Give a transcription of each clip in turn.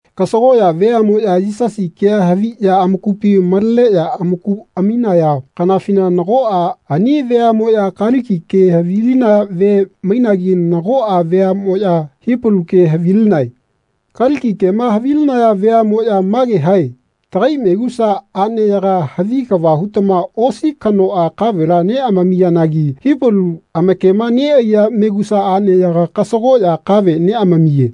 Kasagoꞌya veaꞌmoꞌya Yisasi kea haviꞌya amakupi maleneꞌya amaku aminaya kanafina nagoꞌa ani veaꞌmoꞌya Kaliki ke havilinaya vea mainagi nagoꞌa veaꞌmoꞌya Hipalu ke havilinae. Kaliki kema havilinaya veaꞌmoꞌya mage hae “Tagai megusa aꞌneyaga havi kava hutama osi kanoꞌa kavela neꞌamamiyanagi Hipalu amakema neꞌaiya megusa aꞌneyaga kasagoꞌya kave neꞌamamiye.”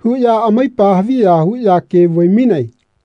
huꞌya amaipa haviya huꞌya ke vai-mainae.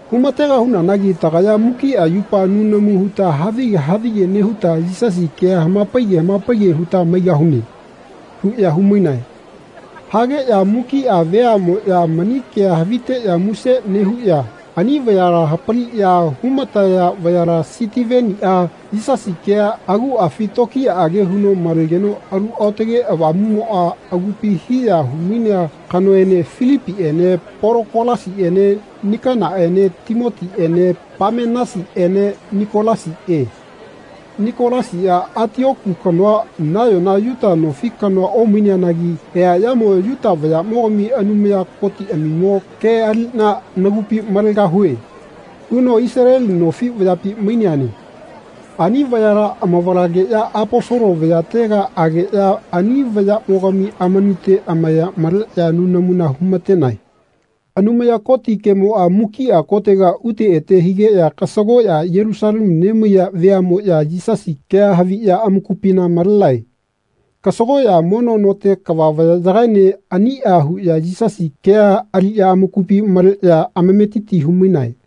Humategahunanagi tagaya mukiꞌa yupa nunamu huta havige havige nehuta Yisasi kea hamapaige hamapaige huta maigahune.” huꞌya humainae. Hageꞌya mukiꞌa veaꞌmoꞌya mani kea haviteꞌya muse nehuꞌya ani vayala hapaliꞌya humataya vayala Sitiveniꞌa, Yisasi kea aguꞌafi tokiyaꞌage huno malegeno Alu Aotage Avamuꞌmoꞌa agupina hiya humainea kanoene Filipiꞌene Polokolasiꞌene Nikanaꞌene Timoniꞌene Pamenasiꞌene Nikolasiꞌe. Nikolasiꞌa Atioku kanoa nayona Yuta nofi kanoa omaineanagi eaꞌyamo “Yuta vayaꞌmogami Anumaya Kotiꞌamimo ke aliꞌna nagupi malegahue.” huno Isaleli nofi vayapi maineane. Ani vayala amavalageꞌya Aposolo vayatega ageꞌya ani vayaꞌmogami amanute amaya maleꞌya nunamuna humatenae. Anumaya Koti kemoꞌa mukiꞌa kotega ute ete higeꞌya kasagoꞌya Yelusalemu nemaiya veaꞌmoꞌya Yisasi kea haviꞌya amakupina malenae. Kasagoꞌya mono note kava vayaꞌyagaene aniꞌa huꞌya Yisasi kea aliꞌya amakupi maleꞌya amametiti humainae.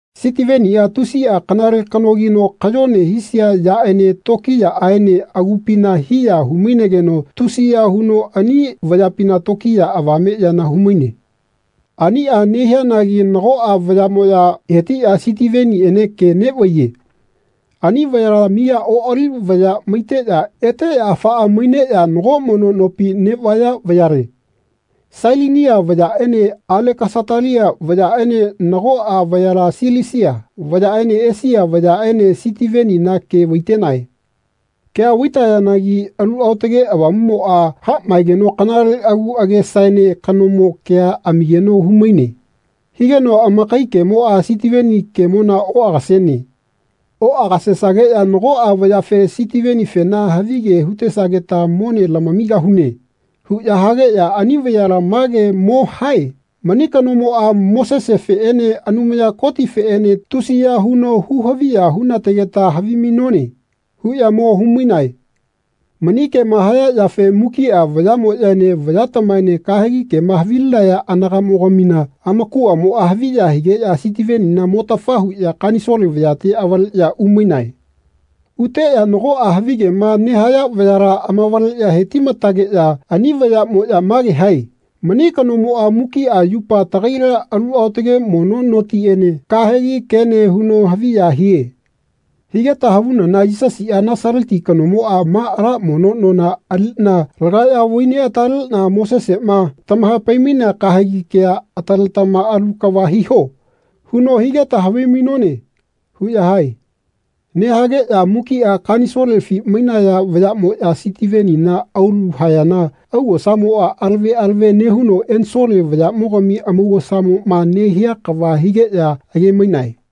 Sitiveniꞌa tusiꞌa kanale kanogino kayone hisia yaꞌene tokiyaꞌaene agupina hiya humainegeno tusiya huno ani vayapina tokiya avame yana humaine. Aniꞌa nehianagi nagoꞌa vayaꞌmoꞌya hetiꞌya Sitiveniꞌene ke neꞌvaiye. Ani vayala miya oꞌali vaya maiteꞌya eteꞌya afaꞌa maineꞌya nago mono nopi neꞌvaya vayale. Sailinia vayaꞌene Alekasatalia vayaꞌene nagoꞌa vayala Silisia vayaꞌene Esia vayaꞌene Sitivenina ke vaitenae. Kea vaitayanagi Alu Aotage Avamumoꞌa haꞌmaegeno kanale agu agesaene kanomo kea amigeno humaine. Higeno amakai kemoꞌa Sitiveni kemona oꞌagasene. Oꞌagasegeꞌya nagoꞌa vayafe “Sitivenifena havige hutesageta mone lamamigahune.” huꞌya hageꞌya ani vayala mage mo hae “Mani kanomoꞌa Mosesefeꞌene Anumaya Kotifeꞌene tusiya huno hu-haviya hunategeta havimainone.” huꞌya mo humainae. Mani kema haya yafe mukiꞌa vayaꞌmoꞌyaene vayatamaene kahegi kema havilinaya anagaꞌmogamina amakuꞌamoꞌa haviya higeꞌya Sitivenina motafa huꞌya Kanisole vayate avaleꞌya umainae. Uteꞌya nagoꞌa havigema nehaya vayala amavaleꞌya hetimatageꞌya ani vayaꞌmoꞌya mage hae “Mani kanomoꞌa mukiꞌa yupa tagaila alu aotage mono notiene kahegi kene huno haviya hie. Higeta havunana Yisasiꞌa Nasaleti kanomoꞌa ma ala mono nona aliꞌna lagaꞌya vaineꞌataleꞌna ‘Moseseꞌma tahapai-mainea kahegi kea ataletama alu kava hiho.’ huno higeta havimainone.” huꞌya hae. Nehageꞌya mukiꞌa Kanisolefi mainaya vayaꞌmoꞌya Sitivenina aulu hayana augosamoꞌa alave alave nehuno ensole vayaꞌmogami amaugosamoꞌma nehia kava higeꞌya age-mainae.